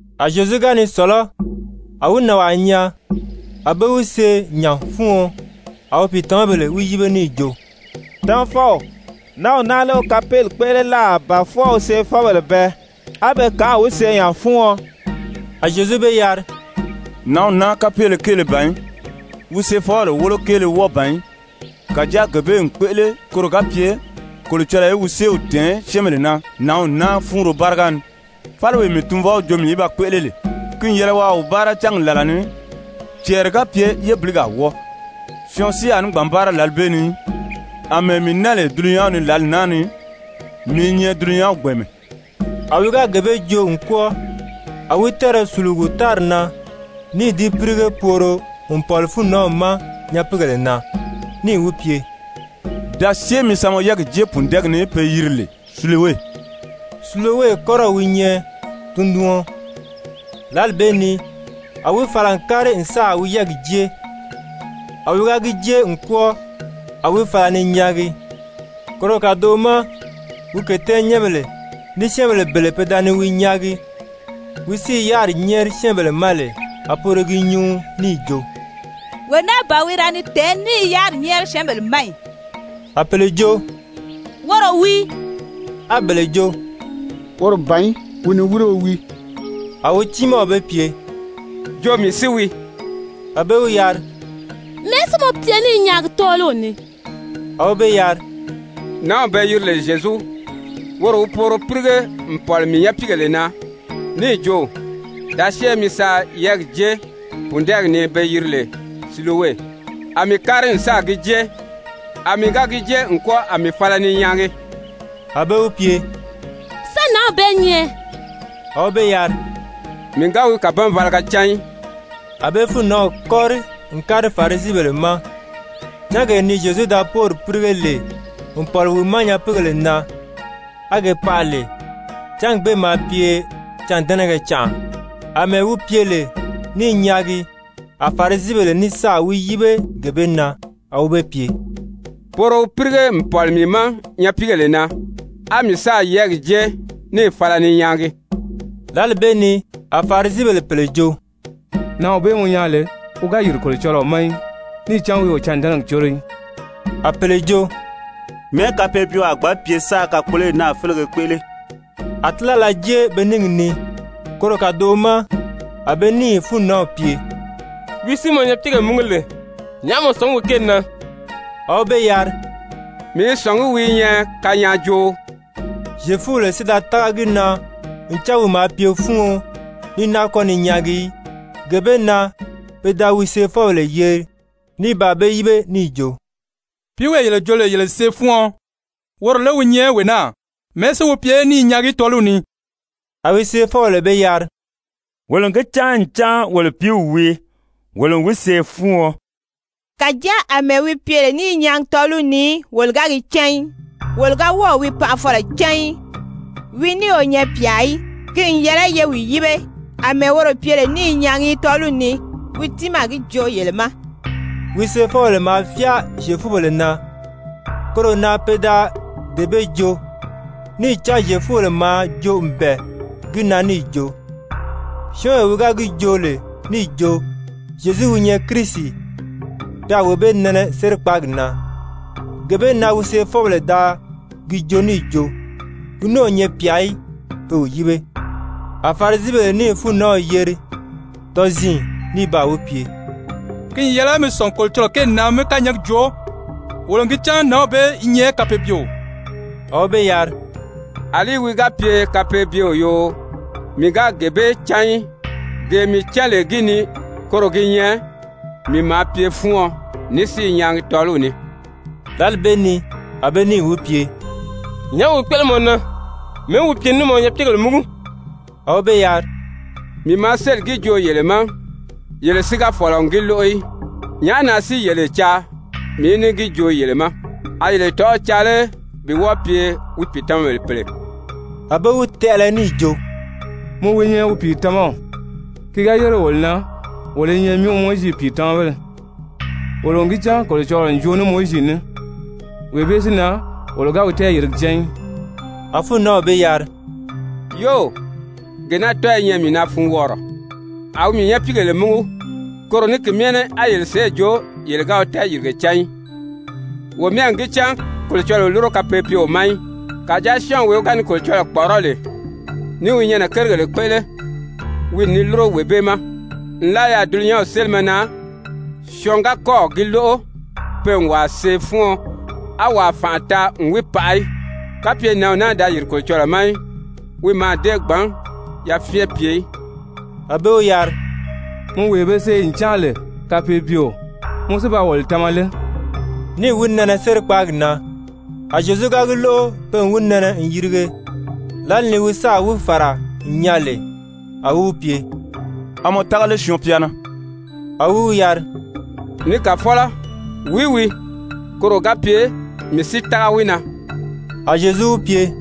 A Zyezu ga ni sɔ̀lɔ́, a wi nànwaa nyaa, a be wi see nya fúuɔn. A wi pìitamabèle wi yíbe níì jo: «Tamafɔw, nǎnw naa lé wi kapeeli kpéʔele láà ba fwɔɔ wi seefɔbèle bɛɛ, á be kànʔâ wi see nya fúuɔn?» A Zyezu be yari: «Nǎnw naa kapeele kéele ban í, wi seefɔbèle wólo kéele wɔ́ɔ ban í. Kàjáa gee bee n kpéʔele koro ga pye Kolocɔlɔɔ í wi séew tɛ̀ɛn syɛ́ɛnbèle na nǎnw naa fúunro báriga ni. Fáliwee mii Tunvɔw jo mii í ba kpéʔele lè, ki n yɛlɛ waa wi báara cángi làla ni. Cɛɛri ga pye yébiligi a wɔ́ɔ, syɔɔn si a ní gbǎn báara lǎli bee ni í. Amɛɛ mii naa lè dulunyanw ni lǎli naa ni, mii i nyɛ dulunyanw gbɛ̀ɛnmɛ.» A wi ga gee bee joo n kwɔ́ɔ, a wi tɛ́ɛrɛ sùlugu tári na níì di pírige pooro n pɔ̀li fúunnanw ma nyapiigèle na, níì wi pye: «Da syée mi sa mɔ yɛ́ɛgi jée pùndɛɛgi ni pe yiri lè Silowe.» (Silowe kɔ́rɔw wi nyɛ tunduɔn.) Lǎli bee ni a wi fala n kári n sáà wi yɛ́ɛgi jée, a wi ga gi jée n kwɔ́ɔ, a wi fala ni nyaagi. Koro kàdoʔo ma wi kètɛ́ɛnnyɛnbèle ní syɛ́ɛnbèle bele pe da ni wi nyaagi wi si i yáriri nyɛ́ɛri syɛ́ɛnbèle ma lè, a poro i gi nyuu níì jo: «Wee naa ban wi da ni tɛ̀ɛ́n ní i yáriri nyɛ́ɛri syɛ́ɛnbèle ma ì?» A pèle jo: «Woro wii.» A bele jo: «Woro ban í, wi niwirio wii.» A wi tiimaw be pye: «Jo mii si wii.» A be wi yari: «Mɛ̀ɛ́ si mɔ pye ní i nyaagi tɔ́ɔliw ni?» A wi be yari: «Nǎnw be yiri lè Zyezu, woro wi pooro pírige n pɔ̀li mii nyapiigèle na níì jo: ‹Da syée mi sa yɛ́ɛgi jée pùndɛɛgi ni be yiri lè Silowe.› A mii kári n sáà gi jée, a mii ga gi jée n kwɔ́ɔ, a mii fala ni nyaagi.» A be wi pye: «Sán nǎnw bee nyɛ?» A wi be yari: «Mii ga wi kàbanvalaga cán í.» A be fúunnanw kɔ́ri n kári Farisibèle ma. Cángee ni Zyezu da póori pírige lè n pɔ̀li wi ma nyapiigèle na á ke paʔa lè, cángi bee maa pye cândɛnɛgɛ canʔa. Amɛɛ wi pye lè ní i nyaagi, a Farisibèle ní sáà wi yíbe gee bee na. A wi be pye: «Pooro wi pírige n pɔ̀li mii ma nyapiigèle na, á mii sáà yɛ́ɛgi jée níì fala ni nyaagi.» Lǎli bee ni a Farisibèle pèle jo: «Nǎnw bee mɔ nyaa lè, wi ga yìri Kolocɔlɔɔ ma í, níì cán wi o cândɛnɛgi córo í.» A pèle jo: «Mɛ̀ɛ́ kapeebyeo a gbǎn pye sáā kakpoloyi naa félege kpéʔele?» A tílala jée be níngi ni. Koro kàdoʔo ma a be níì fúunnanw pye: «Wi si mɔ nyapiigèle múgu lè, nyàʔá mɔ sɔ̀ngí wi kéeli na?» A wi be yari: «Mii i sɔ̀ngí wi i nyɛ kanyaajooo.» Zyefubèle si da tága gi na ncan wi maa pye fúuɔn ní náa kɔ́ ni nyaagi í, gee bee na pe da wi seefɔbèle yeri. Ní baa be yíbe níì jo: «Pìíwee yele jo lè yele n see fúuɔn, woro lé wi nyɛ wee naa? Mɛ̀ɛ́ si wi pye ní i nyaagi tɔ́ɔliw ni?» A wi seefɔbèle be yari: «Wolo n gi cán ncan wolo pìíw wii, wolo n wi see fúuɔn, kàjáa àmɛɛ wi pye lè ní i nyaagi tɔ́ɔliw ni, wolo ga gi cán í, wolo ga wɔ́ɔ̀ wi paʔafɔlɔ cán í, wi ní o nyɛ pyà í, ki n yɛlɛ ye wi yíbe. Amɛɛ woro pye lè ní i nyaagi tɔ́ɔliw ni, wi tiimaa a gi joo yele ma.» (Wi seefɔbèle maa fyáa Zyefubèle na koro na pe da dee bee joo, níì cán Zyefubèle maa joo n bɛ̀ɛ gi na níì jo, syɔ́ɔnwee wi ga gi joo lè níì jo Zyezu wi nyɛ Kirisi, pe a wee bee nɛnɛ sérikpaagi na. Gee bee na wi seefɔbèle da gi joo níì jo wi ní o nyɛ pyà í, pe wi yíbe). A Farisibèle níì fúunnanw yeri tɔziin, ní baa wi pye: «Ki n yɛlɛ mi sɔ̀ngi Kolocɔlɔɔ kéeli na mí kányɛɛgi joo. Wolo n gi cán nǎnw bee i nyɛ kapeebyeo.» A wi be yari: «Alí wi ga pye kapeebyeo yoo, mii ga gee bee cán í. Gee mii cán lè gi ni, koro gi nyɛ mii maa pye fúuɔn ní si i nyaagi tɔ́ɔliw ni.» Lǎli bee ni a be níì wi pye: «Nyàʔá wi kpéʔele mɔ na? Mɛ̀ɛ́ wi pye níì mɔ nyapiigèle múgu?» A wi be yari: «Mii maa sélì gi joo yele ma, yele si ga fɔ̀lɔ n gi lóʔo í. Nyàʔá na si yele caa mii í ní gi joo yele ma? A yele tɔ̀ʔɔ́ caa lé bi wɔ́ɔ pye wi pìitamabèle pèle?» A be wi tɛʔɛlɛ níì jo: «Mɔ wi nyɛ wi pìitamaw. Ki ga yére wolo na, wolo i nyɛ Mowizi pìitamabéle. Wolo n gi cán Kolocɔlɔɔ n joo ní Mowizi ní. Wee bee si na, wolo ga wi tɛɛyìrige cán í.» A fúunnanw be yari: «Yóò, gee naa tɔ́ɔ i nyɛ mii na funwɔɔrɔ. A wi mii nyapiigèle múgu, koro ní ki myɛ ní á yele sèʔê jo yele ga wi tɛɛyìrige cán í! Wo myɛ n gi cán Kolocɔlɔɔ o lúro kapeebyeo ma í. Kàjáa syɔ́ɔnwee wi ga ni Kolocɔlɔɔ kpɔ̀ʔɔrɔ́ lè ní i wi nyɛnɛ kérigèle kpéʔele, wi n ni lúro wee bee ma. Nlaa yaà dulunyanw sélimɛ na, syɔɔn ga kɔ́ɔ̀ gi lóʔo pe n wàa see fúuɔn, á wàa fànʔa taa n wi paʔa í. Kapye nǎnw naa da yìri Kolocɔlɔɔ ma í, wi mǎà dée gbǎn yafyɛn pye í.» A be wi yari: «Mɔ wee be see n cáan lè kapeebyeo, mɔ si ba wolo tama lé?» Níì wi nɛnɛ sérikpaagi na. A Zyezu gi lóʔo pe n wi nɛnɛ n yirige. Lǎli ni wi sáà wi fàra n nyaa lè, a wi wi pye: «A mɔ tága lé Syɔɔn-pya na?» A wi wi yari: «Ni Kàfɔlɔ, wìí wii, koro ga pye mii si tága wi na.» A Zyezu wi pye: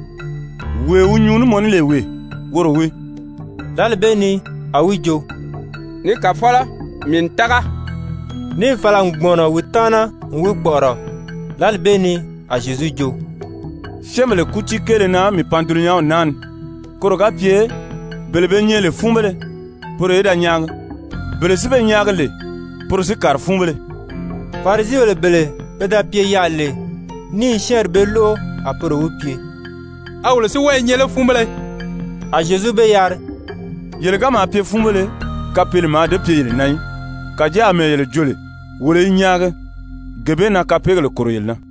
«Wee wi nyuu ní mɔ ní lè wee, woro wii.» Lǎli bee ni a wi jo: «Ni Kàfɔlɔ, mii n tága.» Níì fala n kpùmɔnɔ wi taana n wi kpɔ̀ʔɔrɔ. Lǎli bee ni a Zyezu jo: «Syɛ́ɛnbèle kútii kéele na mii pan dulunyanw naa ni, koro ga pye bele be nyɛ lè fúunbéle, poro í da nyaagi, bele si be nyaagi lè poro si kàri fúunbéle.» Farisibèle bele pe da pye yaà lè níì syɛ́ɛnri bee lóʔo, a poro wi pye: «A wolo si wɔ́ɔ i nyɛ lé fúunbéle?» A Zyezu be yari: «Yele ga maa pye fúunbéle, kapeele mǎà dée pye yele na í. Kàjáa àmɛɛ yele jo lè: ‹Wolo i nyaagi,› gee bee na kapeegèle kòro yele na.»